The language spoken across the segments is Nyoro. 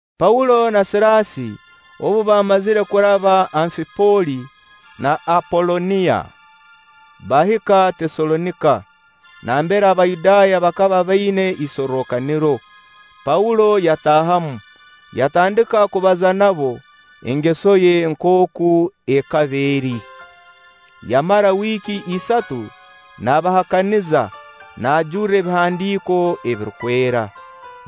Paulo na Siraasi obu baamazire kuraba Anfiipoli na Apolooniya, baahika Teesalonika nambere Abayudaaya bakaba baina isorrokaniro. Paulo yataahamu, yatandika kubaza nabo, engeso ye nkooku ekaba eri. Yamara wiiki isatu naabahakaniza naajurra Ebihandiiko ebirukwera,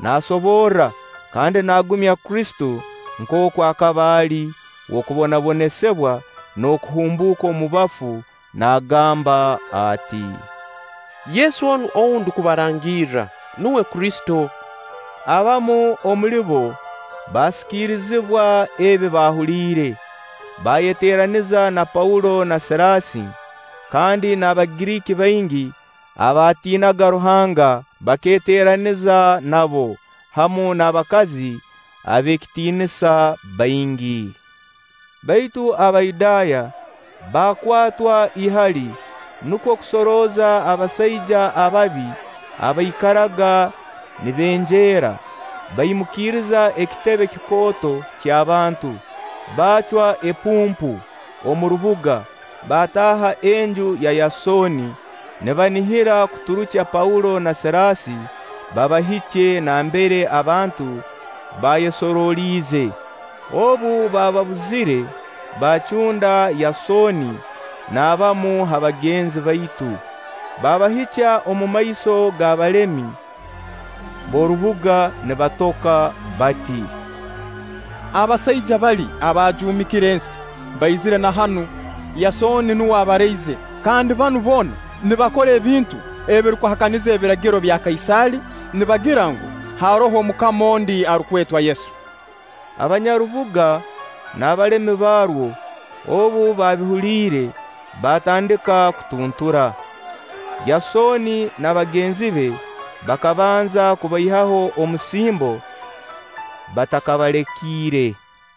naasoborra kandi naagumya Kristo nkooku akaba ali w'okubonabonesibwa n'okuhumbuuka omu bafu, naagamba ati: “Yesu onu ou ndukubarangirra, nuwe Kristo.” Abamu omuli bo baasikirizibwa ebi baahuliire, baayeteeraniza na Paulo na Siraasi. Kandi n'Abagiriiki baingi abaatiinaga Ruhanga bakeeteraniza nabo, hamu n'abakazi ab'ekitiinisa baingi. Baitu Abayudaaya baakwatwa ihali, nukwo kusorooza abasaija ababi abaikaraga nibenjeera, baimukiiriza ekitebe kikooto ky'abantu, baacwa epuumpu omu rubuga. Baataaha enju ya Yasooni, nibanihira kuturukya Paulo na Siraasi babahikye nambere abantu baayesoroliize. Obu baababuzire, baacunda Yasooni n'abamu ha bagenzi baitu, baabahikya omumaiso g'abalemi b'orubuga nibatoka bati: “Abasaija bali abaajumikire ensi, baizire na hanu. Yasooni nuwe abaraize; kandi banu boona nibakora ebintu ebirukuhakaniza ebiragiro bya Kaisaali, nibagira ngu, haroho omukama ondi arukwetwa Yesu.” Abanyarubuga n'abalemi barwo obu baabihuliire, baatandika kutuntura. Yasooni na bagenzi be bakabanza kubaihaho omusimbo batakabalekiire.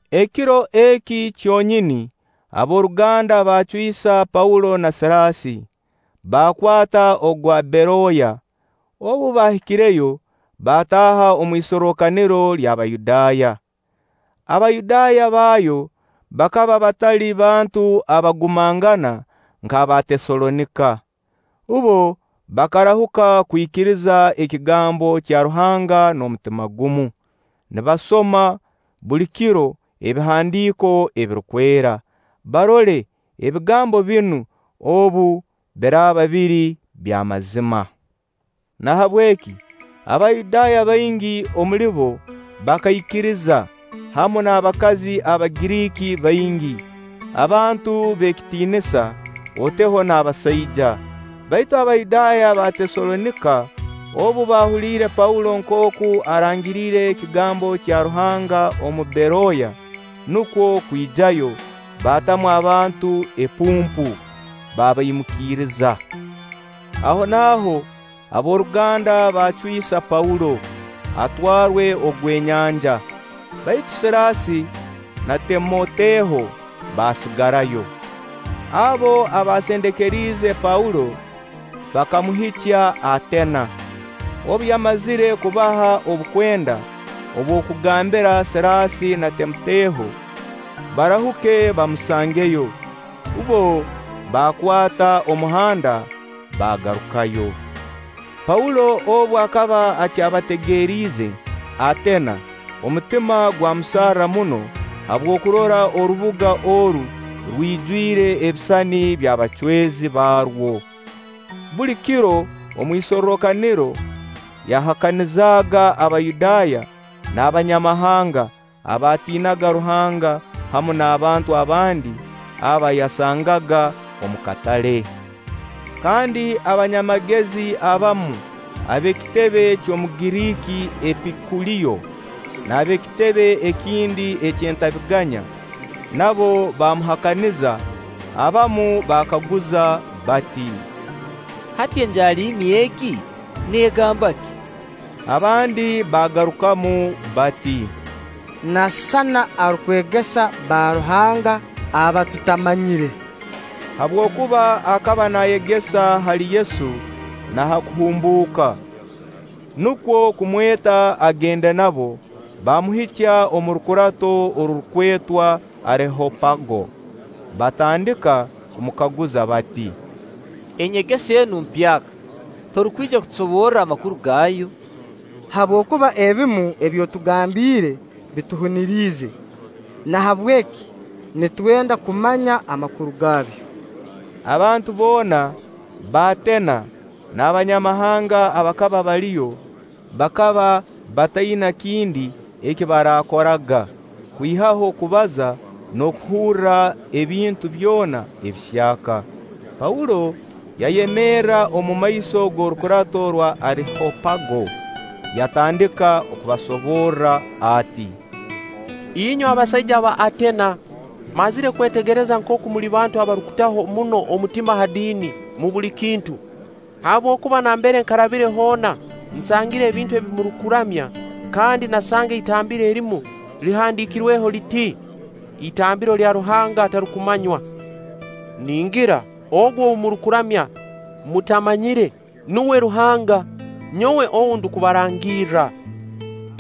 Ekiro eki kyonyini ab'oruganda baacwisa Paulo na Siraasi, baakwata ogwa Beroya. Obu baahikireyo, baataaha omu isorrokaniro ly'Abayudaaya. Abayudaaya baayo bakaba batali bantu abagumangana nk'aba Teesalonika. Bbo bakarahuka kwikiriza ekigambo kya Ruhanga n'omutima gumu, nibasoma buli kiro Ebihandiiko Ebirukwera, barole ebigambo binu obu biraaba biri by'amazima. Nahabweki Abayudaaya baingi omuli bo bakaikiriza, hamu n'abakazi Abagiriiki baingi, abantu b'ekitiinisa, oteho n'abasaija. Baitu Abayudaaya ba Teesalonika obu baahuliire Paulo nkooku arangiriire ekigambo kya Ruhanga omu Beroya, nukwo kwijayo, baatamu abantu epuumpu, baabaimukiriza. Ahonaaho ab'oruganda baacwisa Paulo, atwarwe ogw'enyanja; baitu Siraasi na Timoteho baasigarayo. Abo abaasendekeriize Paulo, bakamuhikya Ateena. Obu yamazire kubaha obukwenda obw'okugambira Siraasi na Timoteho barahuke bamusangeyo, bbo baakwata omuhanda, baagarukayo. Paulo obu akaba akyabategeriize Ateena, omutima gwamusarra muno habw'okurora orubuga oru rwijwire ebisisani by'abacwezi barwo. Buli kiro omu isorrokaniro yahakanizaaga Abayudaaya n'abanyamahanga abaatiinaga Ruhanga hamu na'bantu abandi aba yasangaga omu katale. Kandi abanyamagezi abamu ab'ekitebe ky'Omugiriiki Epikuliyo n'ab'ekitebe ekindi ky'entabiganya nabo baamuhakaniza. Abamu baakaguza bati: “Hati enjaaliimi egi neegamba ki?” Abandi baagarukamu bati: “Nasisana arukwegesa baruhanga aba tutamanyire” habwokuba akaba naayegesa hali Yesu na ha kuhumbuuka. Nukwo kumweta agende nabo, baamuhikya omu rukurato orurukwetwa Arehopago, baatandika kumukaguza bati: “Enyegesa enu empyaka, torukwija kutusoborra amakuru gaayo? Habwokuba ebimu ebi otugambiire bituhuniriize. Nahabweki nitwenda kumanya amakuru gaabyo.” Abantu boona b'Ateena n'abanyamahanga abakaba baliyo, bakaba bataina kindi eki baakoraga kwihaho kubaza n'okuhurra ebintu byona ebihyaka. Paulo yayemerra omumaiso g'orukurato orwa Arehopago yatandika okubasoborra ati: “Inywe abasaija ba Ateena, mmazire kwetegereza nkooku muli bantu abarukutaho muno omutima ha diini mu buli kintu. Habwokuba nambere nkarabire hoona, nsangire ebintu ebi murukuramya, kandi naasanga itambiro erimu erihandiikirweho liti: ‘Itambiro lya ruhanga atarukumanywa.’ Ningira ogu ou murukuramya mutamanyire, nuwe Ruhanga, nyowe ou ndukubarangirra.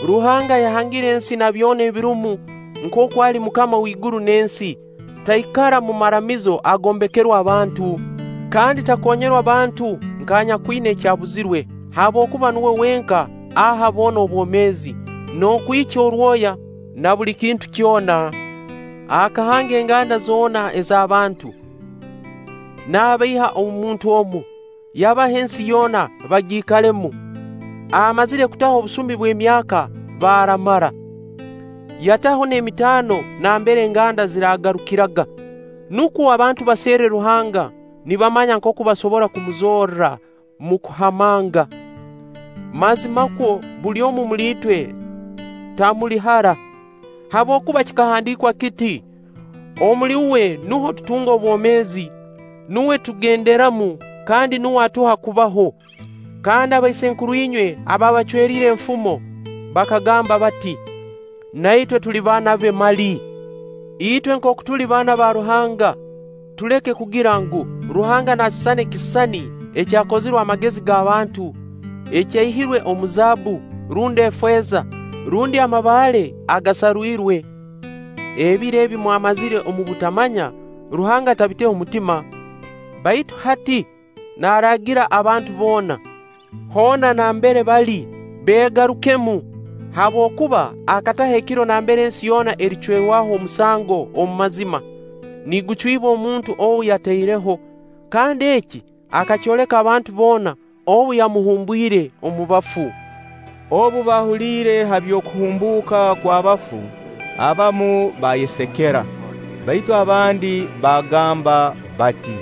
“Ruhanga ayahangire ensi na byona ebirumu nkooku ali MUKAMA w'iguru n'ensi, taikara mu maramizo agombekerwe abantu, kandi takonyerwa bantu nk'anyakwina eki abuzirwe, habwokuba nuwe wenka aha boona obwomeezi, n'okwikya orwoya, na buli kintu kyona. Akahanga enganda zoona eza bantu, nabaiha omu muntu omu, yabaha ensi yoona bagiikalemu, amazire kutaho obusumi bw'emyaka baraamara, yataho n'emitaano nambere enganda ziraagarukiraga, nukwo abantu baserre Ruhanga nibamanya nkooku basobora kumuzorra mu kuhamanga. Mazimakwo buli omu omuli itwe tamuli hara, habwokuba kikahandiikwa kiti: ‘Omuli Uwe nuho tutunga obwomeezi, nuwe tugenderamu kandi nuwe atuha kubaho.’ Kandi abaisenkuru inywe abaabacweriire enfumo bakagamba bati: ‘Na itwe tuli baana be mali.’ Itwe nkooku tuli baana ba Ruhanga, tuleke kugira ngu, Ruhanga nasisana ekisisani ekyakozirwe amagezi g'abantu ekyaihirwe omu zaabbu, rundi efeeza, rundi amabaale agaasarwirwe. Ebiro ebi mwamazire omu butamanya, Ruhanga atabiteho mutima; baitu hati naaragira abantu boona, hoona nambere bali, beegarukemu, habwokuba akataho ekiro nambere ensi yoona ericwerwaho omusango omu mazima, nigucwibwa omuntu ou yataireho, kandi eki akakyoleka abantu boona obu yamuhumbwire omu bafu.” Obu baahuliire ha by'okuhumbuuka kw'abafu, abamu baayesekera; baitu abandi baagamba bati: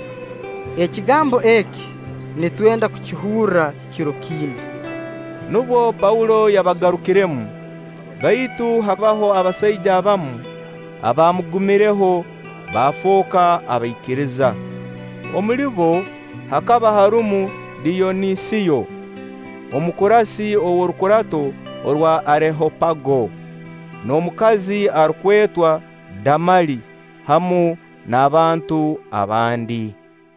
“Ekigambo eki nitwenda kukihurra kiro kindi.” Nubwo Paulo yabarugiremu. Baitu habaho abasaija abamu abaamugumiireho baafooka abaikiriza. Omuli bo hakaba harumu Diyonisiyo, omukurasi ow'orukurato orwa Arehopago n'omukazi arukwetwa Damali, hamu n'abantu abandi.